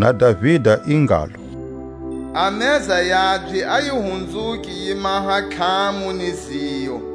Na Davida i ngalo: A meza yabye a yi hunzuke yi maha tlhamu ni ziyo,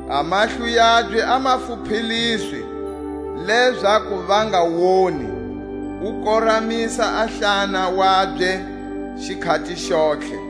A mahlo yabye a ma pfhupeliswe, lezaku va nga woni, U koramisa a hlana wabye xikhati xontlhe.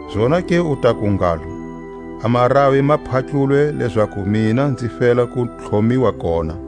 Zonake u taku ngalo: A maravi ma phatlulwe lezaku mina nzi fela ku tlhomiwa kona.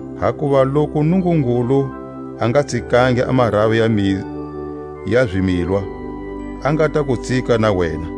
Hakuva loku Nungungulu a nga tsikangi a maravi ya zimilwa, a nga ta ku tsika na wena.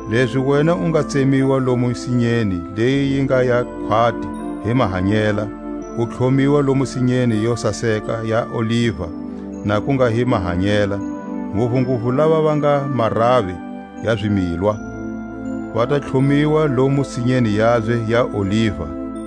Lezi wena u nga tsemiwa lomu sinyeni leyi yi nga ya khwati hi mahanyela, u tlhomiwa lomu sinyeni yo saseka ya oliva na ku nga hi mahanyela; nguvunguvu lava va nga maravi ya zimilwa, va ta tlhomiwa lomu sinyeni yabye ya oliva.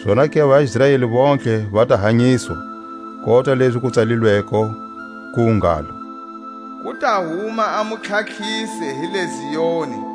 zonake a vaIsraeli vontlhe va ta hanyiswa, kota lezi ku tsalilweko, ku ngalo: Ku ta huma a Mutlhatlhisi hi le Zioni,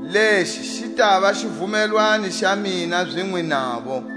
Lexi xi tava xivumelwano xa mina zinwe navo,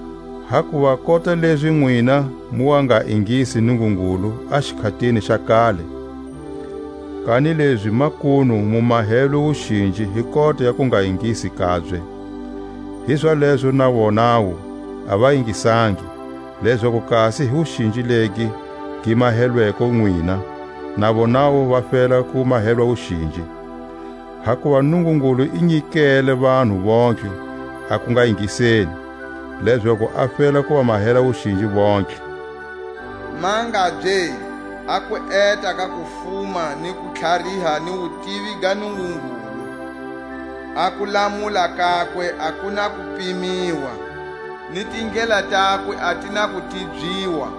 Hakuva kota lezi nwina mu wa nga ingisi Nungungulu a xikhatini xa kale, kanilezi makunu mu mahelwe wuxinji hi kota ya kungaingisi kabye, hizalezo na vonawu a va ingisangi, lezaku kasi hi wuxinji legi gi mahelweko nwina, na vonawu va fela ku mahelwa wuxinji. Hakuva Nungungulu i nyikele vanhu vontlhe a kungaingiseni, lezaku a fela ku va mahela wuxinji yontlhe. Mangabye a kueta ka kufuma ni kutlhariha ni wutivi ka Nungungulu! A kulamula kakwe a ku na ku pimiwa, ni tindlela takwe a ti na ku tibyiwa.